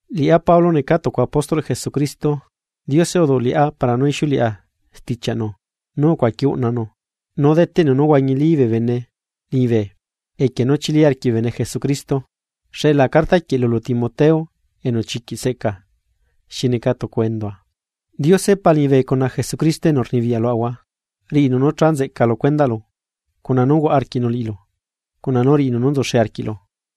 Liꞌá Pablo necaa tucu apóstolꞌ Jesucristo, Diose uduꞌ liꞌá para nú ixiuleꞌa stichiaꞌnu nú ucuaqui uꞌnanu nú deteꞌnu nú huañili bee bene liñibe equie nú chili arquiꞌ bee bene Jesucristo. Xeꞌla carta quieꞌ lulu Timoteo enu chiquiꞌ seꞌca xi neca tucu endua. Diose Pa liñibe cuna Jesucristo enu rnibiyaꞌ luaꞌahua, riꞌinu nú cha nzeꞌca lu cuendaꞌlu cuna nú huaꞌa arquiꞌnu liꞌilu, cuna nú riꞌinu nú nzuxe arquiꞌlu.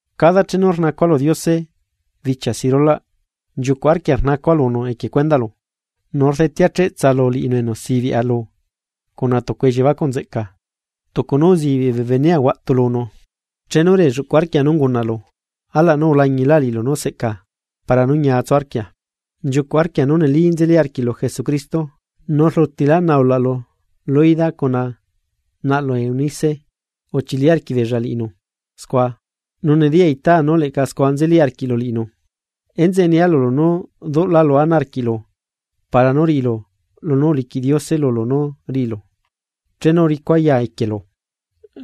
Cada chenu rnacua lu Diose bichia si rulaꞌ nchiucuꞌ arquia rnacua lunu equie cuendaꞌlu, nu rdetea cheꞌtsa lu liꞌinu enu sibiꞌa lu cuna tucu elliebacuꞌ nzeꞌca, tucu nú uzibiꞌ bee benea huaꞌtu lunu. Chenu relluꞌcuꞌ arquia nú ungunaꞌlu, alaꞌ nú ulañilá liꞌilu nú seꞌca para nú ñia tsu arquia. Nchiucuꞌ arquia nú neli nzeli arquiꞌlu Jesucristo, nu rlutilá naulaꞌlu Loida cuna naꞌlu Eunice uchili arquiꞌbeella liꞌinu scua, nu nediya itaa nú leꞌca scua nzeli arquiꞌlu liꞌinu. Enzeꞌe nia lulu nú duꞌlálu ana arquiꞌlu para nú riꞌilu lunú uliquiꞌ Diose lulu nú riꞌilu chenu uricua ya equielu.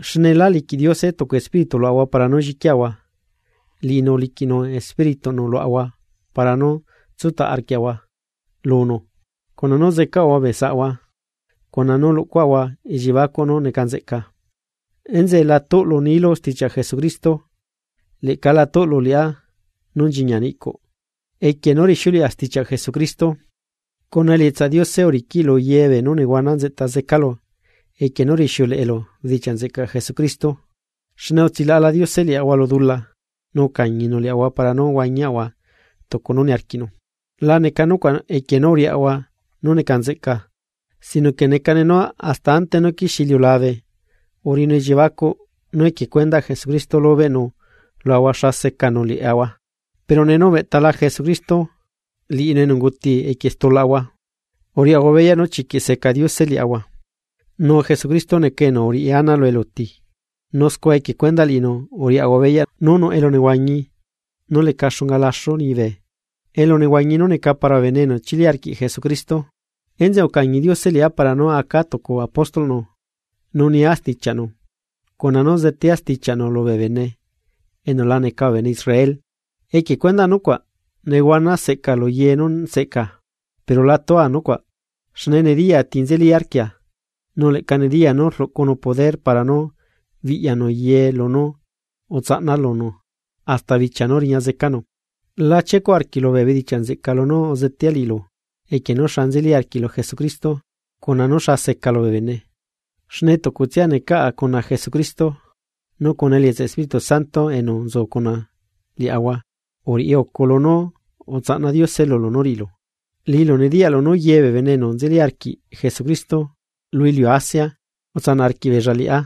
Xne lá liquiꞌ Diose tucu espíritu luaꞌahua para nú lliquiaꞌahua. Liꞌinu uliquiꞌnu Espírituꞌnu luaꞌahua para nú tsutaꞌ arquiaꞌahua lunu cuna nú zecaꞌahua bee saꞌhua cuna nú luꞌcuaꞌahua elliebacuꞌ nú neca nzeꞌca. Enzeꞌe la tuꞌlu nilu stichiaꞌ Jesucristo, leꞌca la tuꞌlu liꞌá nú nchiñia niꞌcuꞌ equie nú rixiuleꞌa stichiaꞌ Jesucristo, cuna elietsaꞌ Diose uriquiꞌ lu ye beenú nehuana nzeꞌta zecalu equie nú rixiuleꞌelu bedichiaꞌ nzeꞌcaꞌ Jesucristo. Xne utsilaꞌala Diose liaꞌahua lu dula, nu ucañinu liaꞌahua para nú huañiaꞌahua tucu nú niarquiꞌnu, la neca nucuaꞌ equie nú uriaꞌahua nú neca nzeꞌca, sino que necane nú hasta ante nú quixie iliulabe uriꞌinu elliebacuꞌ nú equie cuendaꞌ Jesucristo lubeꞌnu luaꞌahua xa secanu liaꞌahua, pero nee nú ubeꞌtala Jesucristo, liꞌinu enu unguti equie stulaꞌahua, uriaꞌahua beyaꞌ nú chiquiꞌ seca Diose liaꞌahua, nu Jesucristo neca enu uriꞌi ana lu eluti, nu scua equie cuendaꞌ liꞌinu uriaꞌahua beyaꞌ nú nuꞌ elunehuañi nú leca xunga laxu liñibe, elu nehuañi nú neca para bee bene enu chili arquiꞌ Jesucristo. Enzeꞌe ucañi Diose liꞌá para nú aca tucu apóstolꞌnu nu nia stichiaꞌnu, cuna nú zetea stichiaꞌnu lu bee bene enu la neca bee bene Israel. Equie cuendaꞌ nucuaꞌ nehuana seꞌca lu ye nú seꞌca, pero la tua nucuaꞌ xne nediya ti nzeli arquia, nu leꞌca nediya nú rluꞌcunu poder para nú biꞌyanu ye lunú utsaꞌna lunu hasta bichia nú riña zecanu. La chiecuꞌ arquiꞌlu bee bedichiaꞌ nzeꞌca nú uzetea liꞌilu equie nú xa nzeli arquiꞌlu Jesucristo, cuna nú xa secalu bee bene, xne tucutsia necaꞌa cuna Jesucristo. Nu cuna elietsaꞌ Espíritu Santo enu nzu cuna liaꞌahua, uriꞌi ucu lunú utsaꞌna Diose lulu nú riꞌilu. Liꞌilu nediyaꞌlu nú ye bee bene enu nzeli arquiꞌ Jesucristo lu iliu Asia utsanaꞌ arquiꞌbeella liꞌá,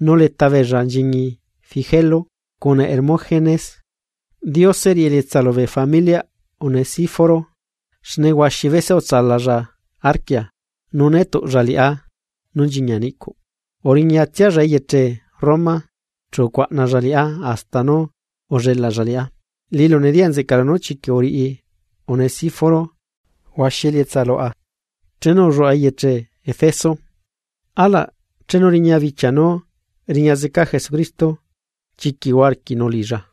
nu leta beella nchiñi Figelo cuna Hermógenes. Diose riꞌi elietsa lubee familiaꞌ Onesíforo, xne huaxi bese utsalalla arquia, nu né tuꞌlla liꞌá nú nchiñia niꞌcuꞌ. Uriñatsialla eyeche Roma, chu ucuaꞌnalla liꞌá hasta nú ullelaꞌlla liꞌá. Liꞌilu nediyaꞌ nzeꞌcaꞌlu nú chiquiꞌ uriꞌi Onesíforo huaxi elietsa luaꞌa chenu ulluaꞌa eyeche Efeso. Alaꞌ chenu riña bichia nú riña zeca Jesucristo, chiquiꞌ huaꞌa arquiꞌnu liꞌilla.